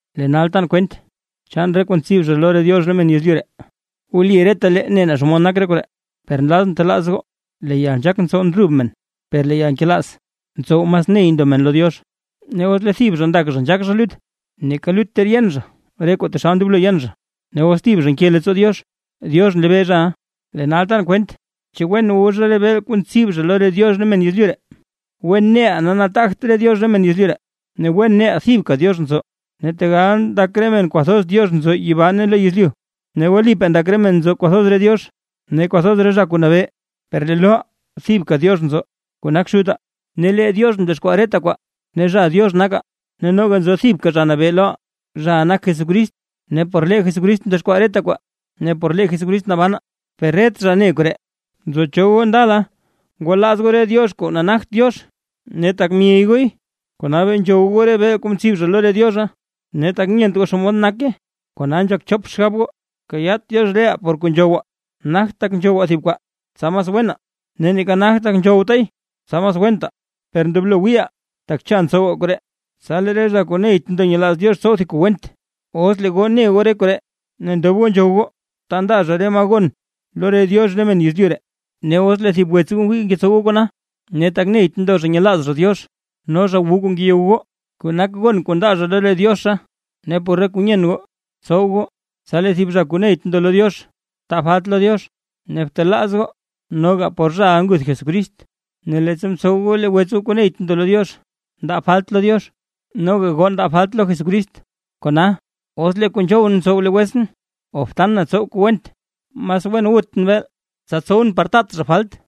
Lee nal tan kwent chaan re kuu ntsib zha lo re diox re men yezlyu ree, wli retalee ne naa xomod nak koree. Per nlazʼn telaaz goo. Lee yalnzhaak ntsow ndrub men, per lee yalnkelaaz ntsow mas ney ndo men lo Diox. Ne os lee thib zha ndak zha nzhaak zha lut, neeka lut ter yen zha re kuu taxal ndoblo yen zhay. Ne os lee thib zha nke leettsoo Diox, Diox nlebee zhaʼa. Lee nal tan kwent, naa chu wen wu zha beel kuu ntsib zha lo re diox re men yezlyu ree. Wen neʼaa nataagt re diox re men yezlyu ree, ne wen neʼaa thibka Diox nzo. Tegal ndak re men kwathoz diox nzo yibaa ne lo yezlyu ree, ne wlipaa ndak re men nzo kwathoz re diox ne kwathoz re zha kuu nabee, per lee loʼaa thibka Diox nzo kuu nak Xutaa, ne lee Diox mdexkwaa reta kwaa, ne zha Diox nakaa. Ne noga nzo thibka Zha Nabee loʼaa, zhaʼa nak Jesucrist, ne por lee Jesucrist mdexkwaa reta kwaa, ne por lee Jesucrist nabanaa. Per ret zha ne koree. Nzo cho goo ndala ngwalaaz goo re diox kuu nagt Diox, ne tak myey gooy, kona bee nzhow goo re beel kuu mbib lo re diozha, ne tak nyent goo xomod nake, kona nzhak chop xgab goo. Kayaat Diox reʼaa por kuu nzhowaa, nagt tak nzhowaa thib kwaa tsa mas wenaa, neeka nagt tak nzhowtaay tsa mas wentaa. Per ndoblo wiiʼaa, tak cha ntsowaa koree, tsa lee re zha kuu neyt ndo nyelaaz Diox tsow thib kuu went. Os lee goo ne goo re koree, ne ndob goo nzhow goo ta ndaa zha re maa gon lo re diox re men yezlyu ree, ne os lee thib wets goo wii ngeyow goo kona, ne tak neyt ndo zha nyelaaz zha Diox no zha wu zha kuu ngeyow goo, kuu nak gon kuu ndaa zha lo re diozha. Ne por re kuu nyen goo, tsow goo tsa lee zha kuu neyt ndo lo Diox taa falt lo Diox, ne btelaaz goo noga por zhaʼa nguth Jesucrist. Ne leettsa ntsow goo lee wets goo kuu neyt ndo lo Diox, ndaa falt lo Diox, noga goo ndaa goo falt lo Jesucrist. Kona, os lee kuu nzhowʼn ntsow lee wetsʼn o btan na tsow kuu went, mas wen wutʼn beel, tsa tsowʼn par taat zha falt.